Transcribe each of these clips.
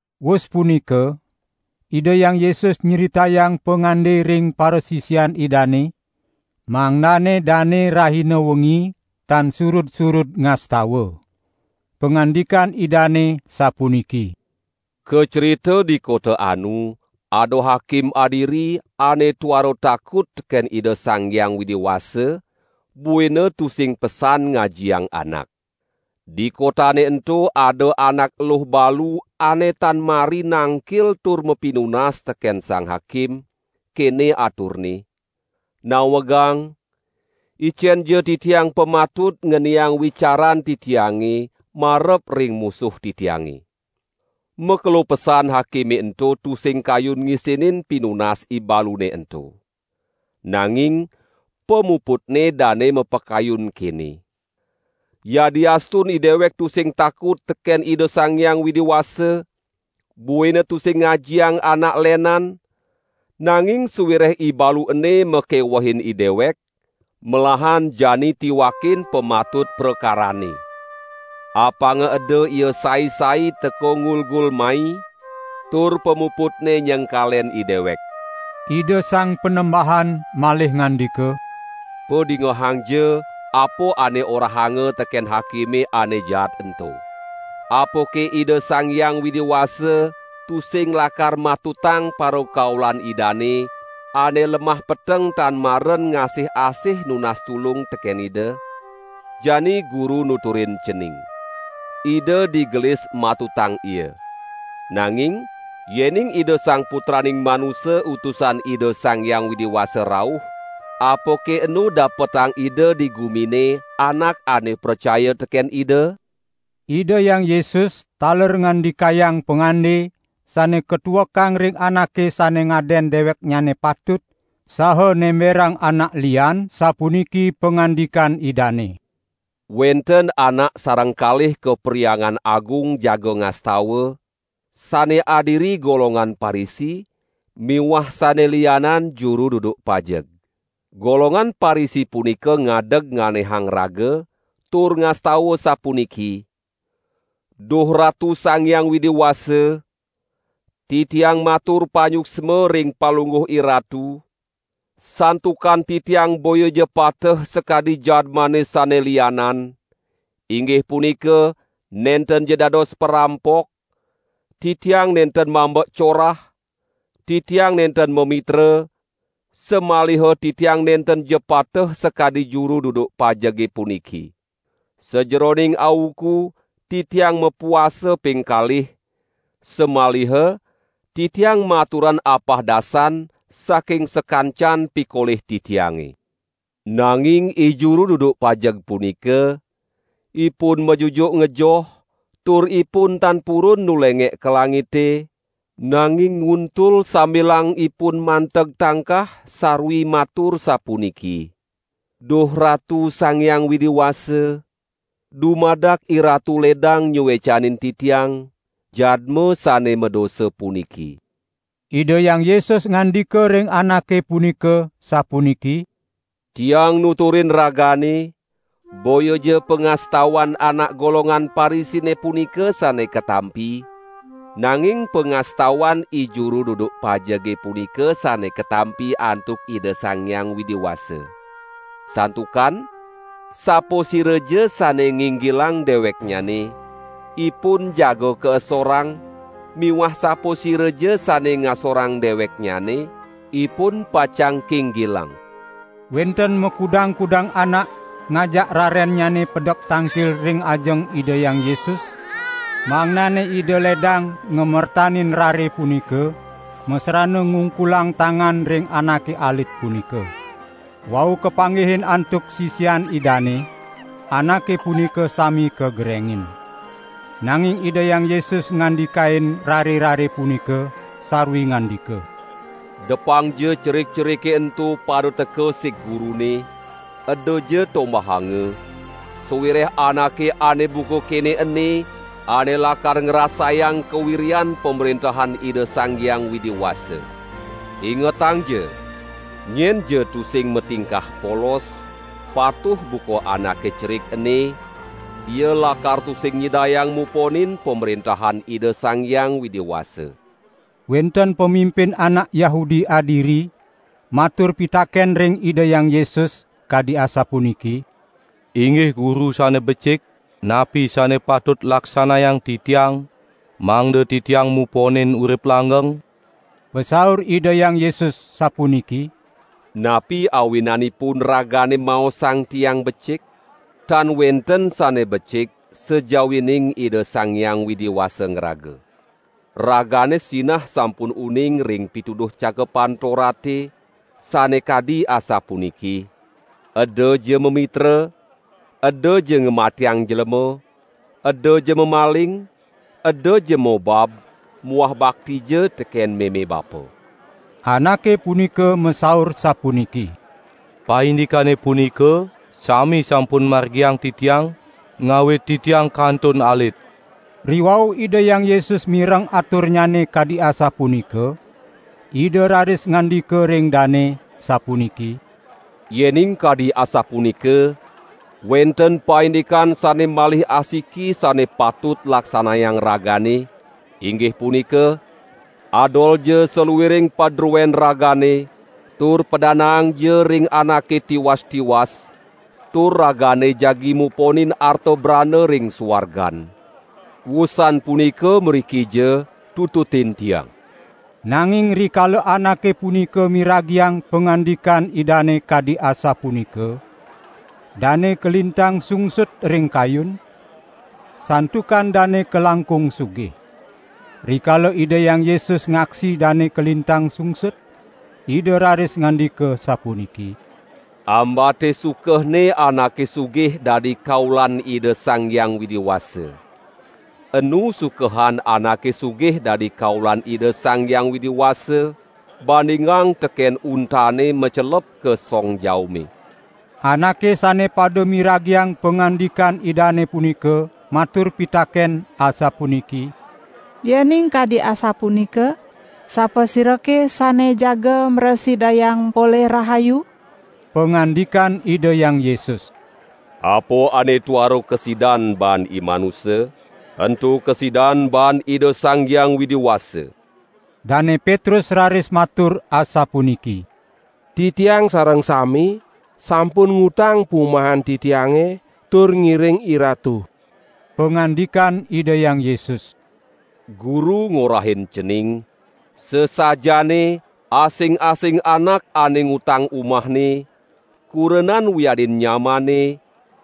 Wus punika, Ida Hyang Yesus nyritayang pangande ring parasisian Idane, mangdane dane rahina wengi tan surud-surud ngastawa. Pangandikan Idane sapuniki: "Kacrita di kota anu, ada hakim adiri, ane tuara takut teken Ida Sang Hyang Widi Wasa, buina tusing pesan ngajiang anak. Di kotane ento ada anak eluh balu ane tan mari nangkil tur mapinunas teken sang hakim, kene aturne: 'Nawegang, icenja titiang pamatut ngeniang wicaran titiange marep ring musuh titiange!' Makelo pesan hakime ento tusing kayun ngisinin pinunas ibalune ento. Nanging pamuputne dane mapakayun kene: 'Yadiastun idewek tusing takut teken Ida Sang Hyang Widi Wasa, buina tusing ngajiang anak lenan, nanging sawireh ibalu ene makewehin idewek, melahan jani tiwakin pamatut prakaranne. Apanga eda ia sai-sai teka ngulgul mai, tur pamuputne nyengkalen idewek!' " Ida Sang Panembahan malih ngandika: "Padingehangja, apa ane orahanga teken hakime ane jaat ento. Apake Ida Sang Hyang Widi Wasa tusing lakar matutang parakaulan Idane, ane lemah peteng tan maren ngasih-asih nunas tulung teken Ida? Jani Guru nuturin cening: Ida digelis matutang ia. Nanging, yening Ida Sang Putraning Manusa Utusan Ida Sang Hyang Widi Wasa rauh, apake enu dapetang Ida di gumine anak ane pracaya teken Ida?" Ida Hyang Yesus taler ngandikayang pangande sane katuekang ring anake sane ngaden deweknyane patut saha nemberang anak lian, sapuniki pangandikan Idane: "Wenten anak sareng kalih ka Perhyangan Agung jaga ngastawa, sane adiri golongan Parisi miwah sane lianan juru duduk pajeg. Golongan Parisi punika ngadeg nganehang raga, tur ngastawa sapuniki: 'Duh Ratu Sang Hyang Widi Wasa, titiang matur panyuksma ring Palungguh IRatu, santukan titiang boyaja pateh sakadi jadmane sane lianan, inggih punika nentenja dados parampok, titiang nenten mambek corah, titiang nenten mamitra, samaliha titiang nentenja pateh sakadi juru duduk pajege puniki. Sajeroning auku titiang mapuasa ping kalih, samaliha titiang maturan apahdasan saking sakancan pikolih titiange.' Nanging ijuru duduk pajeg punika, ipun majujuk ngejoh, tur ipun tan purun nulengek ka langite, nanging ngultul, sambilang ipun manteg tangkah sarwi matur sapuniki: 'Duh Ratu Sang Hyang Widi Wasa, dumadak IRatu ledang nyuecanin titiang, jadma sane madosa puniki.' " Ida Hyang Yesus ngandika ring anake punika, sapuniki: "Tiang nuturin ragane, boyaja pangastawan anak golongan Parisine punika sane katampi, nanging pangastawan ijuru duduk pajege punika sane katampi antuk Ida Sang Hyang Widi Wasa. Santukan sapasiraja sane nginggilang deweknyane, ipun jaga kaesorang miwah sapasiraja sane ngasorang deweknyane, ipun pacang kinggilang." Wenten makudang-kudang anak ngajak rarennyane pedek tangkil ring ajeng Ida Hyang Yesus, mangdane Ida ledang ngamertanin rare punika masrana ngungkulang tangan ring anake alit punika. Wau kapanggihin antuk sisian Idane, anake punika sami kagerengin. Nanging Ida Hyang Yesus ngandikain rare-rare punika, sarwi ngandika: "Depangja cerik-cerike ento pada teka sig Gurune, edaja tombahanga, sawireh anake ane buka kene ene, ane lakar ngrasayang kawiryan Pamrentahan Ida Sang Hyang Widi Wasa. Ingetangja! Nyenja tusing matingkah polos, patuh buka anake cerik ene, ia lakar tusing nyidayang muponin Pamrentahan Ida Sang Hyang Widi Wasa." Wenten pamimpin anak Yahudi adiri, matur pitaken ring Ida Hyang Yesus, kadi asapuniki: "Inggih Guru sane becik, napi sane patut laksanayang titiang, mangda titiang muponin urip langgeng?" Pasaur Ida Hyang Yesus sapuniki: "Napi awinanipun ragane maosang Tiang becik? Tan wenten sane becik sajawining Ida Sang Hyang Widi Wasa ngraga. Ragane sinah sampun uning ring pituduh Cakepan Torate, sane kadi asapuniki: 'Edaja mamitra, edaja ngamatiang jlema, edaja mamaling, edaja mobab muah baktija teken meme bapa.' " Anake punika masaur sapuniki: "Paindikane punika sami sampun margiang titiang, ngawit titiang kantun alit." Riwau Ida Hyang Yesus mireng aturnyane kadi asapunika, Ida raris ngandika ring dane, sapuniki: "Yening kadi asapunika, wenten paindikan sane malih asiki sane patut laksanayang ragane, inggih punika: Adolja saluiring padruen ragane tur padanaangja ring anake tiwas-tiwas, tur ragane jagi muponin arta brana ring suargan. Wusan punika mrikija, tututin Tiang." Nanging rikala anake punika miragiang pangandikan Idane kadi asapunika, dane kalintang sungsut ring kayun, santukan dane kalangkung sugih. Rikala Ida Hyang Yesus ngaksi dane kalintang sungsut, Ida raris ngandika sapuniki: "Ambate sukehne anake sugih dadi kaulan Ida Sang Hyang Widi Wasa. Enu sukehan anake sugih dadi kaulan Ida Sang Hyang Widi Wasa, bandingang teken untane macelep ka song jaume." Anake sane pada miragiang pangandikan Idane punika matur pitaken, asapuniki: "Yening kadi asapunika sapasirake sane jaga mrasidayang polih rahayu?" Pangandikan Ida Hyang Yesus: "Apa ane tuara kasidan baan imanusa, ento kasidan baan Ida Sang Hyang Widi Wasa." Dane Petrus raris matur asapuniki: "Titiang sareng sami sampun ngutang pumahan titiange tur ngiring IRatu." Pangandikan Ida Hyang Yesus: "Guru ngorahin cening, sasajaane asing-asing anak ane ngutang umahne, kurenan wiadin nyamanne,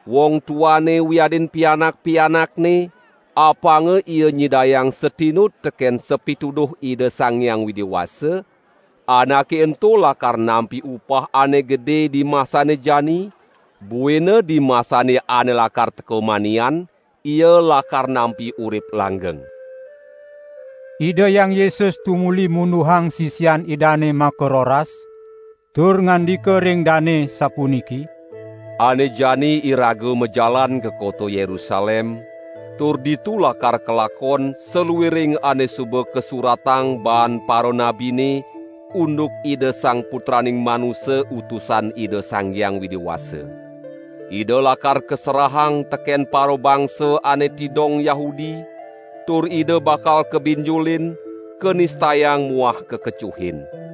wong tuane wiadin pianak-pianakne, apanga ia nyidayang satinut teken sapituduh Ida Sang Hyang Widi Wasa, anake ento lakar nampi upah ane gede dimasane jani, buina dimasane ane lakar teka manian, ia lakar nampi urip langgeng." Ida Hyang Yesus tumuli munduhang sisian Idane makaroras, tur ngandika ring dane, sapuniki: "Ane jani iraga majalan ka kota Yerusalem, tur ditu lakar kalakon saluiring ane suba kasuratang baan paranabine unduk Ida Sang Putraning Manusa Utusan Ida Sang Hyang Widi Wasa. Ida lakar kaserahang teken parabangsa ane tidong Yahudi, tur Ida bakal kabinjulin, kanistayang muah kakecuhin.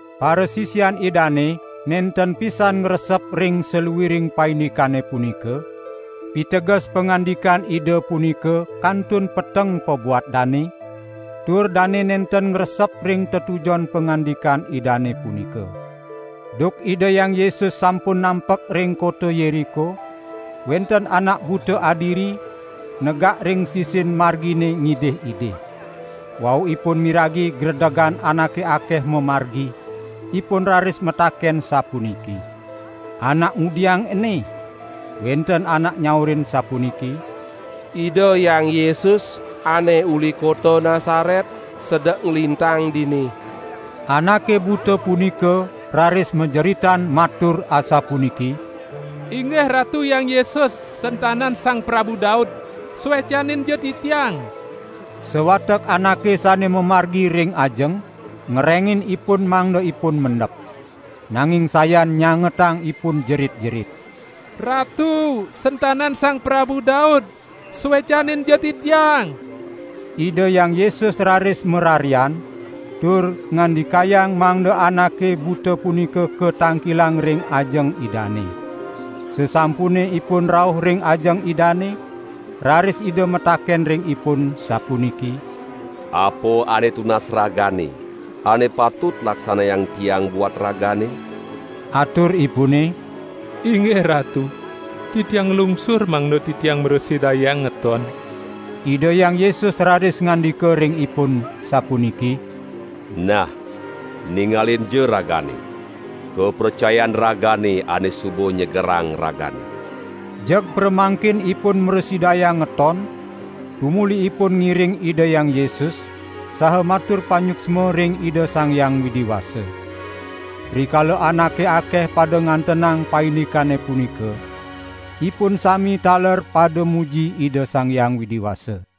Parasisian Idane nenten pisan ngresep ring saluiring paindikane punika; piteges pangandikan Ida punika kantun peteng pabuat dane, tur dane nenten ngresep ring tetujon pangandikan Idane punika. Duk Ida Hyang Yesus sampun nampek ring kota Yeriko, wenten anak buta adiri, negak ring sisin margine ngidih-idih. Wau ipun miragi gredegan anake akeh mamargi, ipun raris mataken sapuniki: "Anak ngudiang ene?" Wenten anak nyaurin sapuniki: "Ida Hyang Yesus ane uli kota Nasaret sedek nglintang dini." Anake buta punika raris majeritan matur asapuniki: "Inggih Ratu Hyang Yesus, sentanan Sang Prabu Daud, suecaninja titiang!" Sawatek anake sane mamargi ring ajeng, ngerengin ipun mangda ipun mendep. Nanging sayan nyangetang ipun jerit-jerit: "Ratu sentanan Sang Prabu Daud, suecaninja titiang!" Ida Hyang Yesus raris mararian, tur ngandikayang mangda anake buta punika katangkilang ring ajeng Idane. Sasampune ipun rauh ring ajeng Idane, raris Ida mataken ring ipun, sapuniki: "Apa ane tunas ragane, ane patut laksanayang Tiang buat ragane?" Aturipune: "Inggih Ratu, titiang nglungsur mangda titiang mrasidayang ngeton!" Ida Hyang Yesus raris ngandika ring ipun, sapuniki: "Nah, ningalinja ragane! Kapracayan ragane ane suba nyegerang ragane!" Jeg pramangkin ipun mrasidayang ngeton, tumuli ipun ngiring Ida Hyang Yesus, saha matur panyuksma ring Ida Sang Hyang Widi Wasa. Rikala anake akeh pada ngantenang paindikane punika, ipun sami taler pada muji Ida Sang Hyang Widi Wasa.